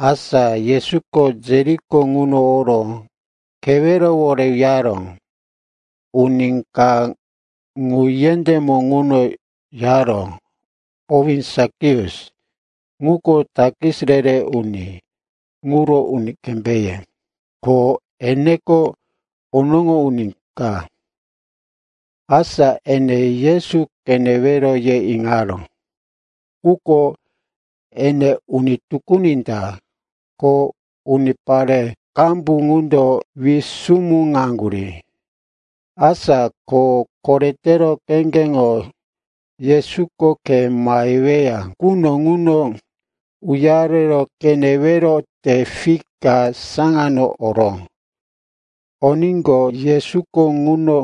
Asa Yesuko Jeriko ŋuno oro kewerowore uyaró. Uni ka ŋu yendémo ŋuno yaró, owí Sakius. Ŋuko takis re-re uni ŋuro uni kembéye, ko eneko onoŋo uni ka. Asa ene Yesu qenewero ye iŋaró, quko ene uni tukuni ta, ko unipare qambu ŋundo wisumuŋaŋgurí. Asa ko korete kheŋgeŋo Yesuko khe maheweya quno ŋuno uyaro qenewero te fik ka saŋano oró. Oníqo, Yesuko ŋuno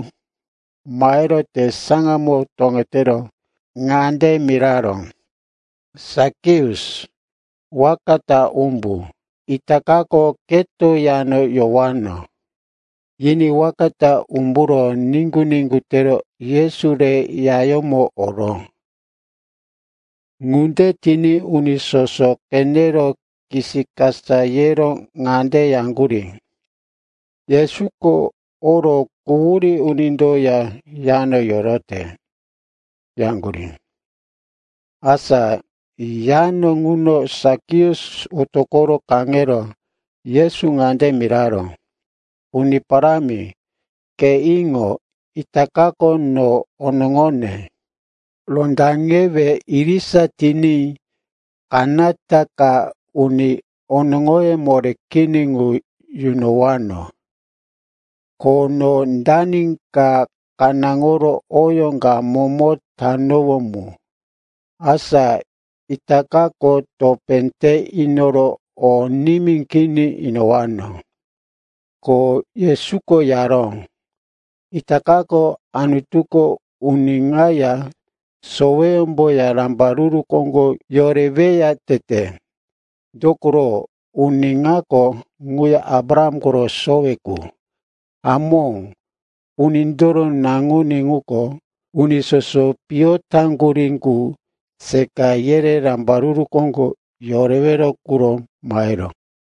mahero te saŋano toŋetero ŋande miraró, “Sakius, waka ta umbu. Itakako keto yano yowano.” Yiní waka ta umburo niŋgu-niŋgu tero Yesu re yayómo oró. Ŋunde tiní uni soso qenero kisikasa yero ŋande yaŋgurí, “Yesuko oro quhurí unindoya yano yorote,” yaŋgurí. Asa yano ŋuno Sakius otoqo kaŋero Yesu ŋande miraró, “Uni Parámi, ke iŋo. Itakako no onoŋone rondaŋewe irisa tiní kanata ka uni onoŋoye moré kini qu yunowano. Ko no dani ka kanáŋoro oyó ka momo tanowó mu, asa itakako topé te inoro o nimí kini inowano.” Ko Yesuko yaró, “Itakako Anutuko uni ŋaya soweyómboya rambaruru koŋgo yoreweya tete. Dokoro uni ŋako ŋuya Abraham koro sowe qu. Hamó, Unindoro Naŋuní ŋuko uni soso piyo taŋgurí qu seqa yere rambaruru koŋgo yorewero quro maheró.”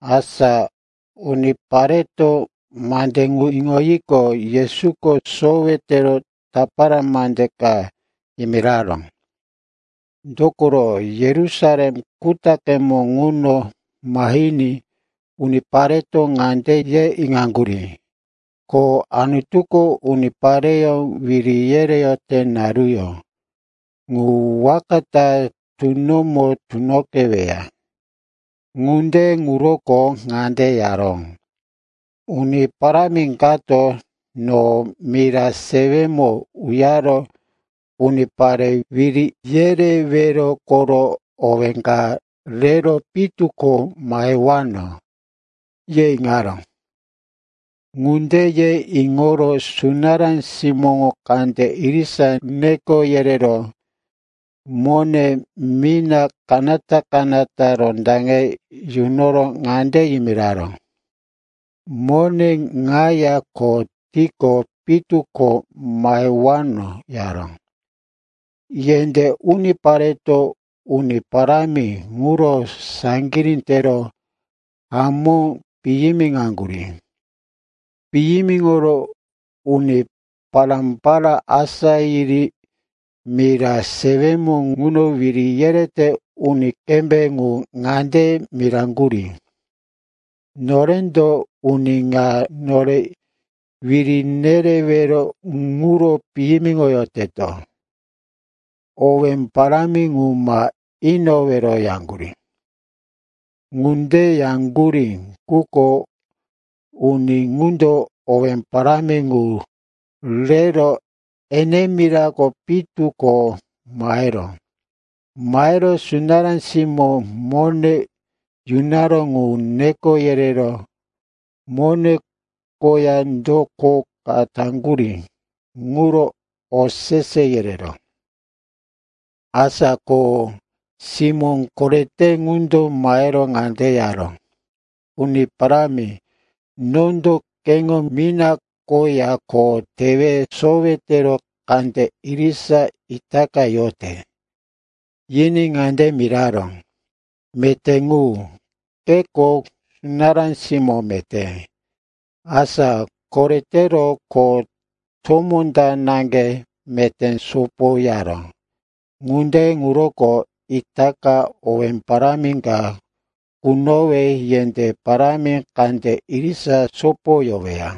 Asa unipareto mande ŋu iŋoyiqo, Yesuko sowe tero tapara mande ka yimiraró. Dokoro Yerusalem kutaqemo ŋuno mahiní unipareto ŋande ye iŋaŋgurí, ko Anutuko unipareyó wiri yereyote naruyó ŋu waka ta tunomo tunoqeweya. Ŋunde ŋuroko ŋande yaró, “Uni parámi kato, no mira sewemo uyaro unipare wiri yerewero koro owé ka rero pitu ko mahewano, ye iŋaró. Ŋunde ye iŋoro sunará simóŋo kande irisa neko yerero mone mina kanata-kanata rondaŋe yunoro ŋande yimiraró, ‘Mone ŋaya kho tiqo pitu ko mahewano,’ yaró. “Yendé unipareto uni parámi ŋuro saŋgirí tero hamó piyimiŋaŋgurí. Piyimiŋoro uni pará-pará asá yiri mira sewemo ŋuno wiri yerete uni kembé ŋu ŋande miraŋgurí, ‘Norendo uni ŋa nore wiri nerewero ŋuro piyimiŋoyoteto. Owé parámi ŋu ma inowero,’ yaŋgurí. “Ŋunde yaŋgurí, quko uni ŋundo owé parámi ŋu rero ene mirako pitu ko maheró. Mahero sunará simó mone yunaró ŋu neko yerero mone koya do kho ka taŋgurí ŋuro osese yereró. “Asa kho simó korete ŋundo mahero ŋande yaró, ‘Uni parámi, nondo keŋo mina koya kho tewe sowe tero kande irisa itaka yote.’ “Yiní ŋande miraró, ‘Meté ŋu! Keko sunará simó meté! Asa koretero kho tomó ta naŋge meté sopoyaró. Ŋunde ŋuroko itaka owé parámi ka kunowe yendé parámi kande irisa sopoyoweya.’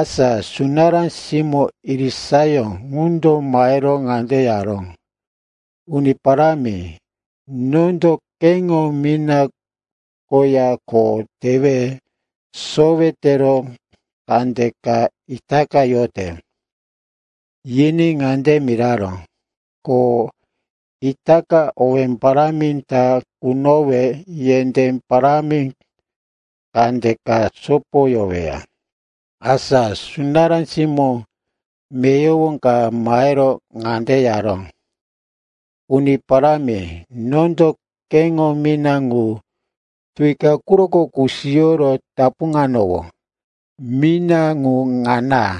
“Asa sunará simó irisayó ŋundo mahero ŋande yaró, ‘Uni parámi, nondo keŋo mina koya kho tewe sowe tero kandeka itaka yote.’ “Yiní ŋande miraró, ‘Ko itaka owé parámi ta kunowe yendé parámi kandeka sopoyoweya.’ “Asa sunará simó meyowo ka mahero ŋande yaró, ‘Uni parámi, nondo keŋo mina ŋu tuwi ka quroko kusiyoro tapuŋanowó. Mina ŋu ŋana.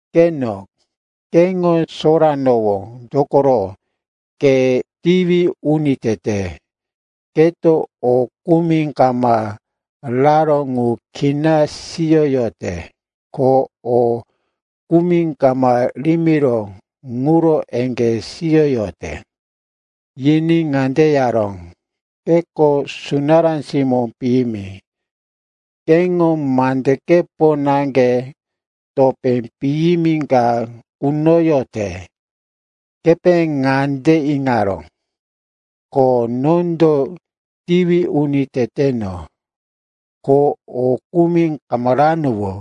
Qeno, keŋo soranowó, dokoro ke tiwi uni tete. Keto o kumi kama raró ŋu kina siyoyote, ko o kumi kama rimiró ŋuro eŋgé siyoyote.’ “Yiní ŋande yaró, ‘Keko sunará simó piyimi. Keŋo mandekepo naŋge topé piyimi ka kunoyote. Kepe ŋande iŋaró, ko nondo tiwi uni teteno, ko o kumi kama ranowó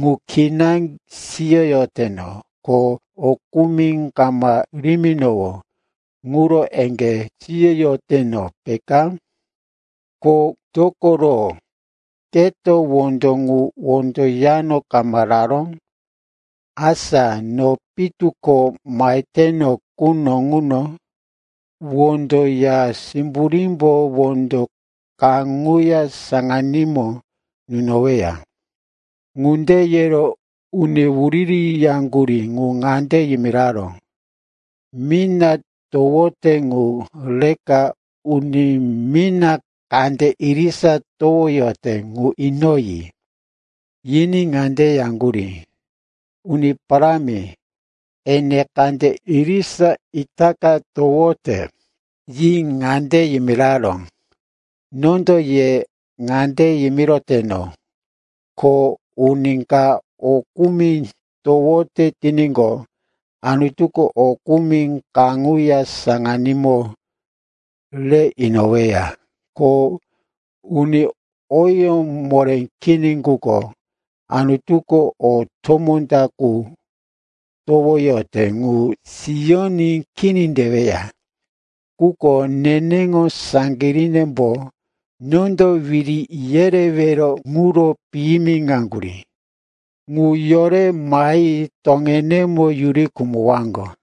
ŋu kina siyoyoteno, ko o kumi kama riminowó ŋuro eŋgé siyoyoteno, peka? Ko dokoro keto wondo ŋu wondo yano kama raró? Asa no pitu ko maheteno quno ŋuno wondo ya simburímbo wondo kaŋuya saŋanímo nunoweya.’ “Ŋunde yero uni wuririyaŋgurí ŋu ŋande yimiraró, ‘Mina towote ŋu reka uni mina kande irisa towoyote ŋu inoyi.’ “Yiní ŋande yaŋgurí, ‘Uni parámi, ene kande irisa itaka towote!’ “Yi ŋande yimiraró, ‘Nondo ye ŋande yimiroteno, ko uni ka o kumi towote tiníqo, Anutuko o kumi kaŋuya saŋanímo rero inoweya. Ko uni oyó moré kini ŋuko, Anutuko o tomó ta qu towoyote ŋu siyoní kini teweya. Quko neneŋo saŋgirínembo nondo wiri yerewero ŋuro piyimiŋaŋgurí, ŋu yore mahi toŋenemo yuri khumowaŋgo.’”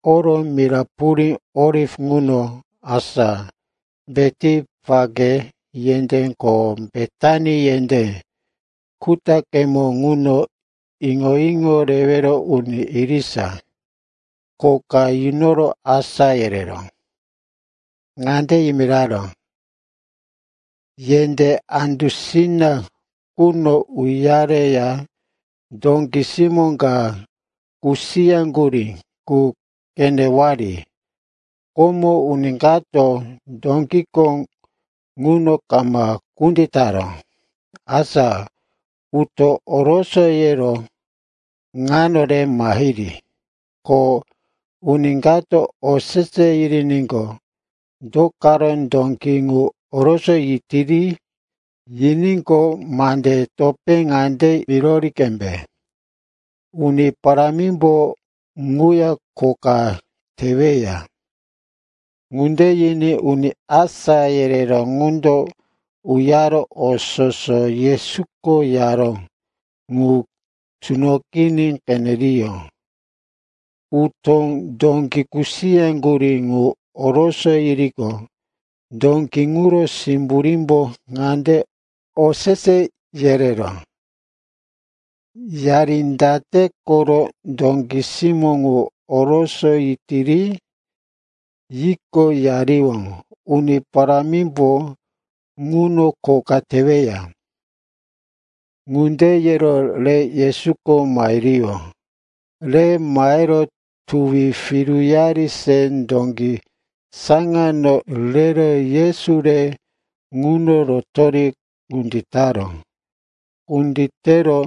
Oro mira purí Oliv ŋuno, asa Betipake yendé ko Betani yendé kutaqemo ŋuno, iŋo-iŋo rewero uni irisa kho ka yunoro asá yereró. Ŋande yimiraró, “Yendé andusina ŋuno uyareya dóki simó ka kusiyaŋgurí qu qenewari. Komo uni kato dókiko ŋuno kama kunditaró. Asa utó orosoyero ŋano re mahiri. Ko uni kato osese yiriníqo, ‘Do karo dóki ŋu orosoyitiri?’ yiníqo, mande topé ŋande mirori qembe, ‘Uni Parámimbo ŋuya kho ka teweya.’” Ŋunde yiní uni asá yereró ŋundo uyaro o soso Yesuko yaró ŋu tunoqiní qeneriyó. Utó dóki kusiyaŋgurí ŋu orosoyiriqo, dóki ŋuro simburímbo ŋande osese yereŋgurí, “Yari date koro dóki simó ŋu orosoyitiri?” Yiqo, yariyó, “Uni Parámimbo ŋuno kho ka teweya.” Ŋunde yero rero Yesuko mahiriyó. Re mahero tuwi piruyari se dóki saŋano rero Yesu re ŋuno rotori kunditaró. Kunditero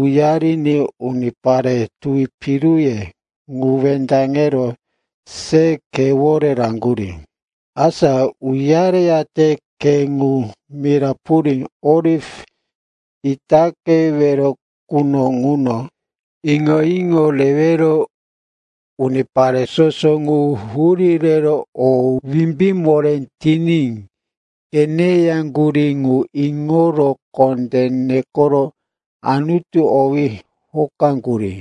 uyariní unipare tuwi piruye ŋu wendaŋero se khewore raŋgurí. Asa uyareyate khe ŋu mira purí Oliv itaqewero quno ŋuno iŋo-iŋo rewero unipare soso ŋu hurí rero o wimbí moré tiní qeneyaŋgurí ŋu iŋoro kondé nekoro Anutu owí hokoyaŋgurí.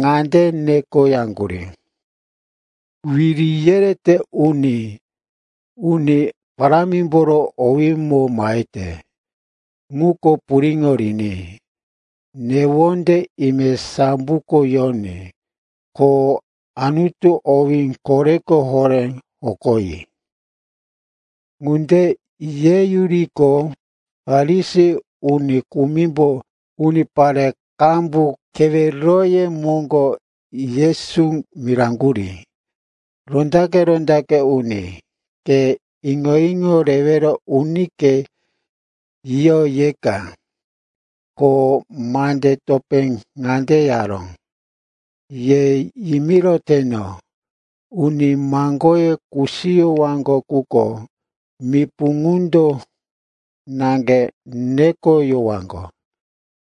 Ŋande nekoyaŋgurí, “Wiri yerete uni Uni Parámimboro owímo mahete, ŋundo puriŋo riní! Newonde ime samboko yoní, ko Anutu owí koreko horé hokoyi.” Ŋunde yeyuriqo, Farisi uni kumimbo unipare qambu keweroye moŋgo Yesu miraŋgurí, “Rondaqe-rondaqe uni, ke iŋo-iŋo rewero unike yiyo yeka.” Ko mande topé ŋande yaró, “Ye yimiroteno, uni maŋgoye kusiyowaŋgo quko mipu ŋundo naŋge nekoyowaŋgo.”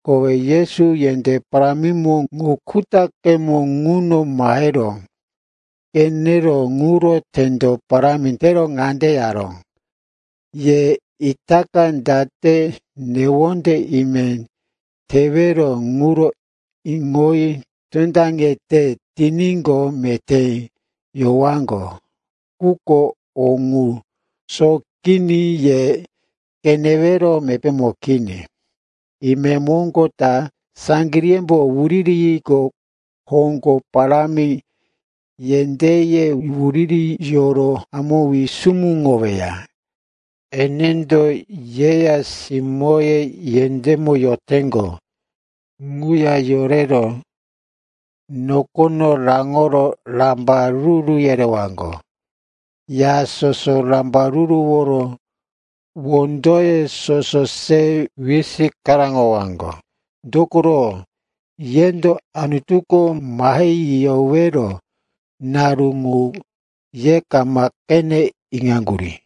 Kowe Yesu yendé parámi ŋu kutaqemo ŋuno mahero qenero ŋuro tendo parámi tero ŋande yaró, “Ye itaka date newonde ime tewero ŋuro iŋoyi tondaŋete tiníqo, meté yowaŋgo. Quko o ŋu sóqiní ye qenewero mepémo kini. Imemoŋgo ta saŋgiríyembo wuriri yiriqo, hoŋgo parámi yendéye wuririyoro hamó wisumuŋoweya. Enendo yeya simóye yendémo yoteŋgo ŋuya yorero nokono raŋoro rambaruru yerewaŋgo. Ya soso rambaruruworo wondoye soso se wisikaraŋowaŋgo, dokoro yendo Anutuko mahe yiyowero naru ŋu ye kama qene iŋaŋgurí.”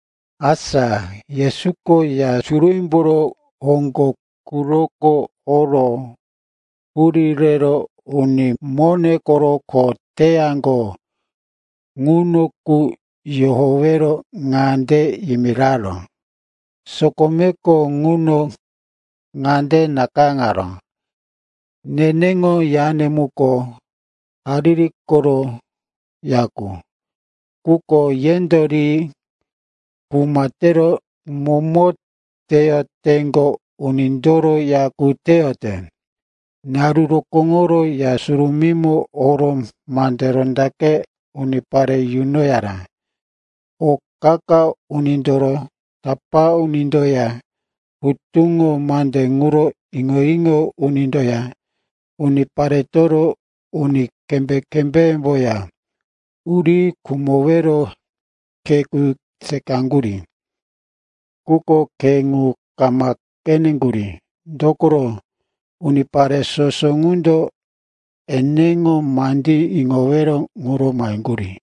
Asa Yesuko Ya Surumímboro hoŋgo quroko oro hurí rero uni mone koro kho teyaŋgo ŋuno qu yohowero ŋande yimiraró, “Sokomeko ŋuno ŋande nakayáŋaró, ‘Neneŋo yane muko hariri koro ya qu.’ Quko yendo ri ‘kuma tero momo teyoteŋgo unindoro ya qu teyote.’” Naru rokóŋoro Ya Surumímo oro mande rondaqe unipare yunoyaró. O qa-qa unindoro tapá unindoya hutuŋo mande ŋuro iŋo-iŋo unindoya uniparetoro uni kembé-kembémboya uri khumowero khe qu seqayaŋgurí. Quko khe ŋu kama qeneŋgurí, dokoro unipare soso ŋundo eneŋo mandí iŋowero ŋuro maheyaŋgurí.